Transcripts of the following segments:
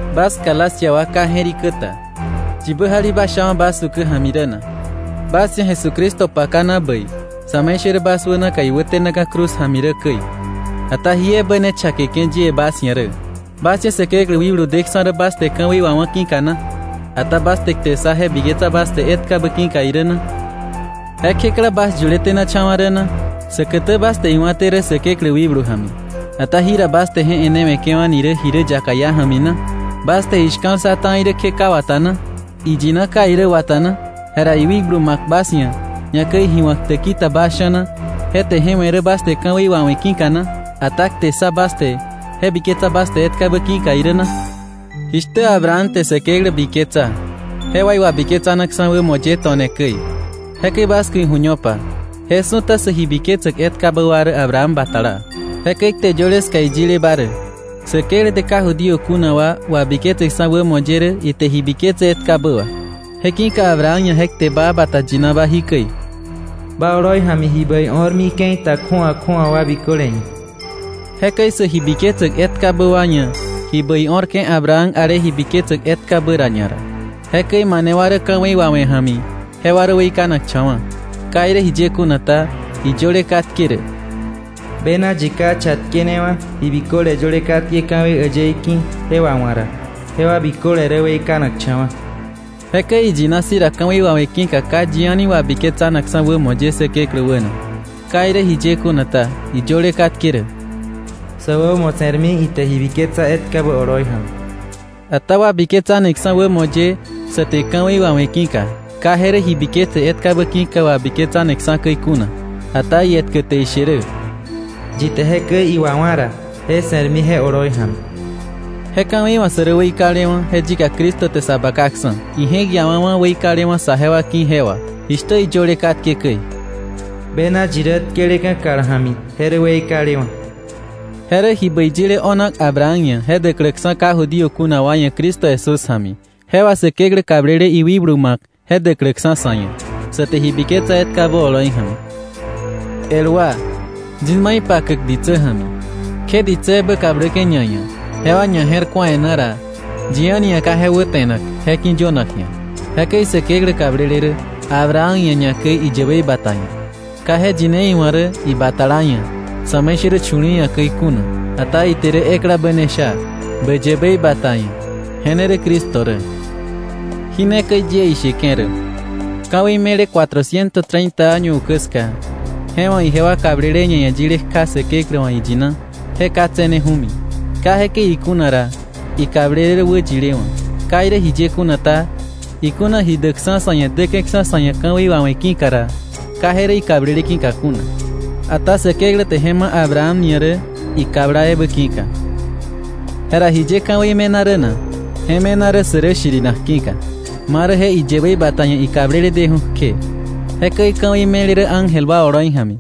Bas Galacia wa ka je̱rikä ta. ¿Yibä jalibasha bas ukä ja̱mi rä na? Bas ia̱ Jesucristo pakana bäi sa̱me̱ishärä bas wä naka iwätenaka̱ cruz ja̱mi rä käi. Ata jí ebä ne chakeke̱ yie bas ia̱ rä: ¿Bas ia̱ Säkeklä wikblu deksa̱ rä bas te ka̱wei wawá̱ ki̱ka na, ata bas te kte ssa je biketsa bas te etkabä ki̱ka irä na? ¿Je kjekla bas yuletenacha̱wa̱ rä na? Säkätä bas te iwa̱té rä Säkeklä wikblu ja̱mi, ata ¿jira bas te je e̱newe̱ke̱wa̱ni rä ji rä yaka iá ja̱mi na? ¿Bas te ji shka̱l ssa ta̱i rä kje ka wata na? ¿Iyina ka irä wata na? Jera iwikblu ma̱k bas ia̱, ñakäi ji wa̱k täki ta bas sha̱na, ¿je te je we̱ rä bas te ka̱wei wawe̱ ki̱ka na, ata kte ssa bas te je biketse bas te etkabä ki̱ka irä na? Jishtä Abraham te Säkeklä biketsa, je wà iwabiketsanaksa̱ wämo ye to̱ne käi, jekäi bas ku̱ iju̱ñopa, je su̱ta sä ji biketsäk etkabä wa rä Abraham batala. Jekäi kte yöle ska iyileba rä Säkeklä te ka Judío kuna wa wabiketseksa̱ wämo ye rä ite ji biketse etkabä wà. Je ki̱ka Abraham ia̱ je kte baa bata yinaba jikäi: “Ba oloi ja̱mi ji bäi o̱rmi ke̱i ta kju̱awa kju̱awa wa biköle ia̱.” Jekäi sä ji biketsäk etkabä wa ia̱ ji bäi o̱rke̱ Abraham ale ji biketsäk etkabä ra ñara. Jekäi mane wa rä ka̱wei wawe̱ ja̱mi, jewa rä weikanakcha̱wa̱. Ka irä jiye kuna ta, iyöle katke rä: “Bena yi ka chatkenewa̱ ji biköle yöle katke ka̱wei äyëí ki̱ je wawa̱k ra, jewa biköle rä weikanakcha̱wa̱.” Jekäi iyina si̱ ra ka̱wei wawe̱ ki̱ka ka yi a̱ni wabiketsanakksa̱ wämo ye Säkeklä wäna. Ka irä jiye kuna ta, iyöle katke rä: “Sä wämo se̱rmi ite ji biketsa etkabä oloi ja̱mi.” Ata wabiketsaneksa̱ wämo ye sa te ka̱wei wawe̱ ki̱ka, ka je rä ji biketse etkabä ki̱ka wabiketsaneksa̱ käi kuna. Ata ietkä te ishe rä: “Yi te jekäi iwawa̱ ra, je se̱rmi je oloi ja̱mi.” Je ka̱wei wa̱ sä rä weikalewa̱, je yika Cristo te sa bakaksa̱, ije̱k iawawa̱ weikalewa̱ saje wa ki̱ je wà, jishtä iyöle katke käi: “Bena yi rä tkeleka̱ kal ja̱mi je rä weikalewa̱.” Je rä ji bäi yile o̱nak Abraham ia̱ je däkläksa̱ ka Judío kuna wa ia̱ Cristo Jesús ja̱mi, je wà Säkeklä kablele iwikblu ma̱k je däkläksa̱ sa̱ ia̱, sa te ji biketsa etkabä oloi ja̱mi. El wa, yis ma ipakäk ditsä ja̱mi. Kje ditsä ebä kabläke̱ ñaia̱, jewa ñaje̱rku̱a e̱ná ra, yi a̱ni ia̱ ka je wäte̱nak je ki̱yönak ji̱a. Jekäi Säkeklä kablele rä Abraham ia̱ ñakäi iyäbei bata ia̱. Ka iwa̱ iyine, “Ibatala ia̱” sa̱me̱ishärä chu̱li̱i̱ ia̱ käi kuna, ata eklabä ia̱. Ite isha rä: “Ba yäbei bata ia̱”, je rä Cristo. Jí ne käi yie isheke̱ rä: Ka̱wei me̱le cuatrociento treinta año ukä ska, je wa̱ ijewa kablele ñaia̱ yile kja Säkeklä wa̱ iyina, je ka tse̱neju̱mi. Ke jekäi ikuna ra, ikablele rä wäyilewa̱. Ka irä jiye kuna ta, ikuna ji däkksa̱ sa̱ ia̱ däke̱ksa̱ sa̱ ia̱ ka̱wei wawe̱ ki̱ka ra, ka je rä ikablele ki̱ka kuna; ata Säkeklä te je ma̱ Abraham ia̱ rä, ikabla ebä ki̱ka. Jera, ¿jiye ka̱wei me̱na rä na? Je me̱na rä sä rä shirinak ki̱ka, marä je iyäbei bata ia̱ ikablele deju̱ kje. Jekäi ka̱wei me̱le rä ángel wa oloi ja̱mi,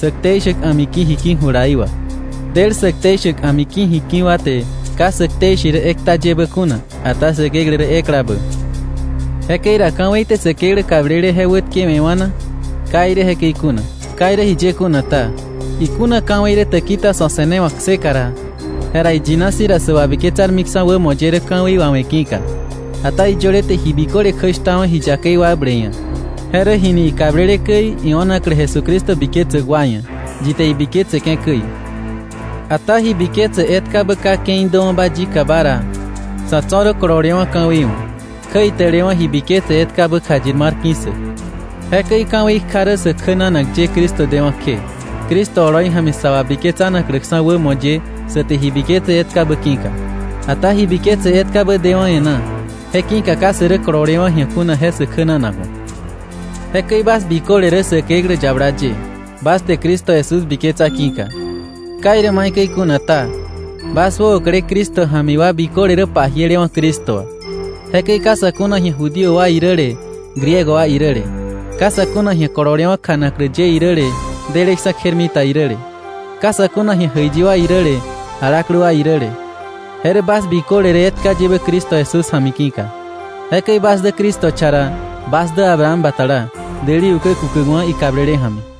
sä ktei shäk a̱miki̱ jiki̱ julaí wà. Del sä ktei shäk a̱miki̱ jiki̱ wa te ka sä ktei she rä ekta yebä kuna, ata Säkeklä rä eklabä. Jekäi ra, ¿ka̱wei te Säkeklä kablele je wätkewe̱wa̱ na? ¡Kai irä jekäi kuna! Ka irä jiye kuna ta, ikuna ka̱wei rä täki ta sa̱ se̱newa̱k kseka ra, jera iyina si̱ ra sä wabiketsarmiksa̱ wämo ye rä ka̱wei wawe̱ ki̱ka. Ata iyöle te ji biköle kjäshtawa̱ ji yakei wakble ia̱. Je rä jini ikablele käi io̱naklä Jesucristo biketsäk wa ia̱, yi te ibiketseke̱ käi. Ata ji biketse etkabä ka ke̱i däwa̱ba yikaba ra, sa̱ tso̱ rä kololewa̱ ka̱wei wa̱, kjäitälewa̱ ji biketse etkabä kjayir mar ki̱ssäk. Jekäi ka̱wei kja rä sä kjänanak ye Cristo dewa̱ kje, Cristo oloi ja̱mi sa wabiketsäkläksa̱ wämo ye sa te ji biketse etkabä ki̱ka. Ata ji biketse etkabä dewa̱ e̱ná, je ki̱ka ka sä rä kololewa̱ ji̱a kuna je sä kjänanak wa̱. Jekäi bas biköle rä Säkeklä yabala ye, bas te Cristo Jesús biketsa ki̱ka. Ka irä maikäi kuna ta, bas wäokle Cristo ja̱mi wa biköle rä pajielewa̱ Cristo wà. Jekäi ka sa̱ kuna ji̱a Judío wa iräle Griego wa iräle. Ka sa̱ kuna ji̱a kololewa̱ kjanaklä ye iräle, deleksa̱ kjermita iräle. Ka sa̱ kuna ji̱a jäiyi wa iräle, alaklä wa iräle. Je rä bas biköle rä etka yebä Cristo Jesús ja̱mi ki̱ka. Jekäi bas dä Cristo cha ra, bas dä Abraham batala, däli ukä kukäkwa̱ ikablele ja̱mi.